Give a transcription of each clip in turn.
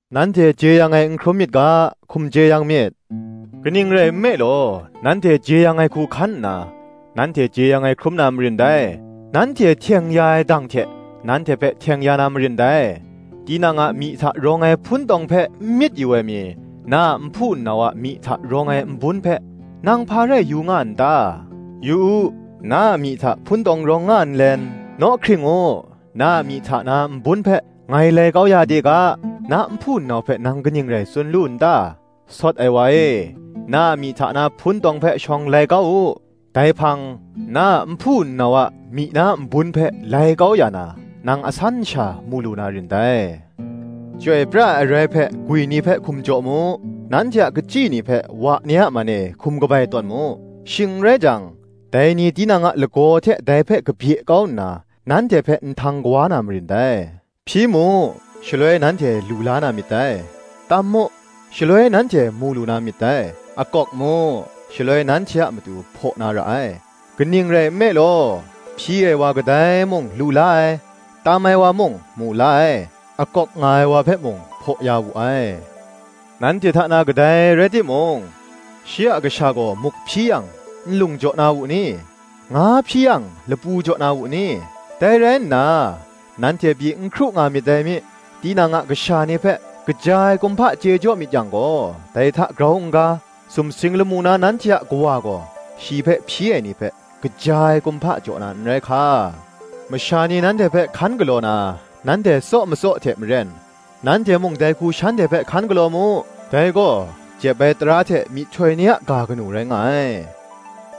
Nanhte jeyang ai n hkrum myit ga, hkum jeyang myit. Kaning rai nme law, nanhte jeyang ai hku hkan nna, nanhte jeyang ai hkrum na marin dai; nanhte hteng ya ai dang hte, nanhte hpe hteng ya na marin dai. Tinang a myi hta rawng ai hpuntawng hpe n myit yu ai mi, na a nhpu nnau a myi hta rawng ai nbun hpe, nang hpa rai yu nga n ta? Yu u, na a myi hta hpuntawng rawng nga nlen, Naw hkring u, na a myi hta na nbun hpe ngai lai kau ya de ga, na nhpu nnau hpe nang kaning rai tsun lu n ta? Sawt ai wa e, na a myi hta na hpuntawng hpe shawng lai kau u; dai hpang, na a nhpu nnau a myi na nbun hpe lai kau ya na, nang asan sha mu lu na rin dai. Chyoi pra ai arai hpe gwi ni hpe hkum jaw mu; nanhte a hkachyi ni hpe wa ni man e hkum kabai tawn mu: shing n rai jang, dai ni tinang a lagaw hte dai hpe kabye kau nna, nanhte hpe nhtang kawa na marin dai. Hpyi mu, shaloi nanhte lu la na myit dai; tam mu, shaloi nanhte mu lu na myit dai; akawk mu, shaloi nanhte a matu hpaw na ra ai. Kaning rai nme law, hpyi ai wa kadai mung lu la ai; tam ai wa mung mu la ai, akawk nga ai wa hpe mung, hpaw ya wu ai. Nanhte hta na kadai rai timung, shi a kasha gaw muk hpyi yang, nlung jaw na wu ni? nga hpyi yang, lapu jaw na wu ni? Dai rai nna, nanhte pyi n hkru nga myit dai mi, tinang a kasha ni hpe kaja ai kumhpa chye jaw myit yang gaw, dai hta grau n-ga, sumsing lamu na nanhte a Kawa gaw, shi hpe hpyi ai ni hpe kaja ai kumhpa jaw na n rai hka! Masha ni nanhte hpe hkan galaw na, nanhte tsaw matsaw hte maren, nanhte mung dai hku shanhte hpe hkan galaw mu: dai gaw, jep ai tara hte myihtoi ni a ga kanu rai nga ai.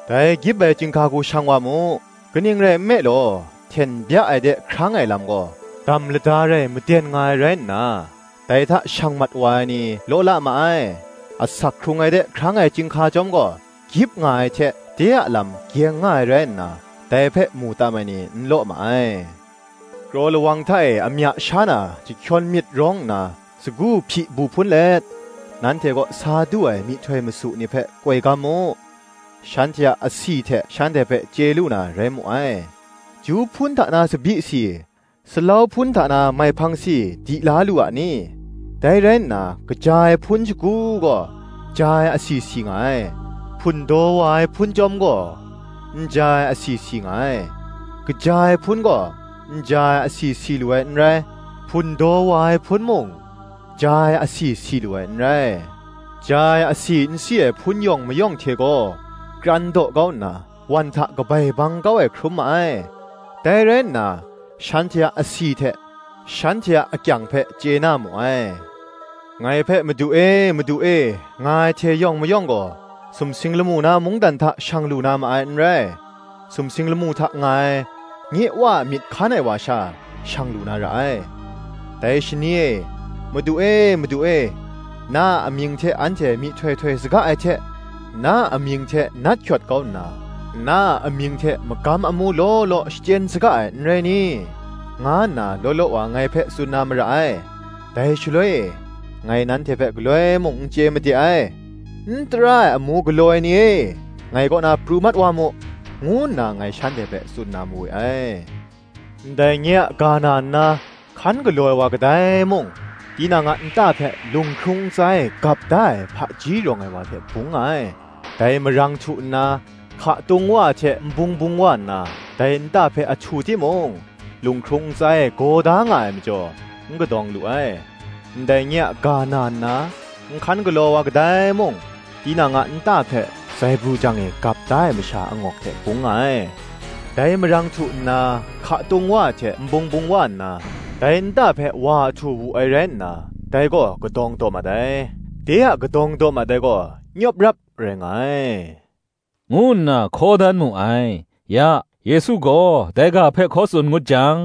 Dai gyip ai chyinghka hku shang wa mu: kaning rai nme law, hten bya ai de hkrang ai lam gaw, dam lada rai maden nga ai rai nna, dai hta shang mat wa ai ni law la ma ai. Asak hkrung ai de hkrang ai chyinghka chyawm gaw, gyip nga ai hte de a lam gyeng nga ai rai nna, dai hpe mu tam ai ni n law ma ai. Kraw lawang hta e amya sha na chyahkyawn myit rawng nna, sagu hpyi bu hpun let nanhte kaw sa du ai myihtoi masu ni hpe koi gam mu. Shanhte a asi hte shanhte hpe chye lu na rai mu ai. Ju hpun hta na tsabyi si, salau hpun hta na maihpang si di la lu a ni? Dai rai nna kaja ai hpun shagu gaw ja ai asi si nga ai; hpundaw wa ai hpun chyawm gaw, n ja ai asi si nga ai: kaja ai hpun gaw n ja ai asi si lu ai n rai, hpundaw wa ai hpun mung, ja ai asi si lu ai n rai. Ja ai asi n si ai hpun yawng mayawng hte gaw, kran daw kau nna wan hta kabai bang kau ai hkrum ma ai. Dai rai nna, shanhte a asi hte, shanhte a akyang hpe chye na mu ai. Ngai hpe, ‘Madu e, Madu e,’ nga ai hte yawng mayawng gaw, sumsing lamu na mungdan hta shang lu na ma ai n rai: sumsing lamu hta nga ai, nye Wa a myit hkan ai wa sha, shang lu na ra ai. Dai shani e, ‘Madu e, Madu e,’ na a amying hte anhte myihtoi htoi saga ai hte, na a amying hte nat hkyawt kau nna, na a amying hte magam amu law law shachyen saga ai, n rai ni? nga nna law law wa ngai hpe tsun na mara ai. Dai shaloi e, ‘Ngai nanhte hpe galoi mung n chye made ai; n tara ai amu galaw ai ni e, ngai kaw na pru mat wa mu,’ ngu nna ngai shanhte hpe tsun na mawe ai. “Ndai nye a ga na nna, hkan galaw ai wa kadai mung, tinang a nta hpe lunghkrung ntsa e gap da ai hpaji rawng ai wa hte bung nga ai. Dai marang htu nna, hka tung wa ai hte nbung bung wa nna, dai nta hpe ahtu timung, lunghkrung ntsa e gaw da nga ai majaw, n kadawng lu ai. Ndai nye a ga na nna, n hkan galaw ai wa kadai mung, tinang a nta hpe zaibru jang e gap da ai masha angawk hte bung nga ai. Dai marang htu nna, hka tung wa ai hte nbung bung wa nna, dai nta hpe wa ahtu wu ai rai nna dai gaw kadawng daw mat ai: de a kadawng daw mat ai gaw nyawp rap rai nga ai,” ngu nna hkaw dan mu ai. Ya, Yesu gaw dai ga hpe hkaw tsun ngut jang,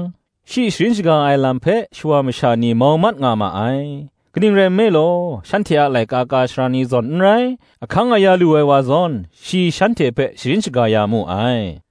shi sharin shaga ai lam hpe shawa masha ni mau mat nga ma ai; kaning rai nme law, shanhte a laika ka ai sara ni zawn n rai, ahkang aya lu ai wa zawn, shi shanhte hpe sharin shaga ya mu ai.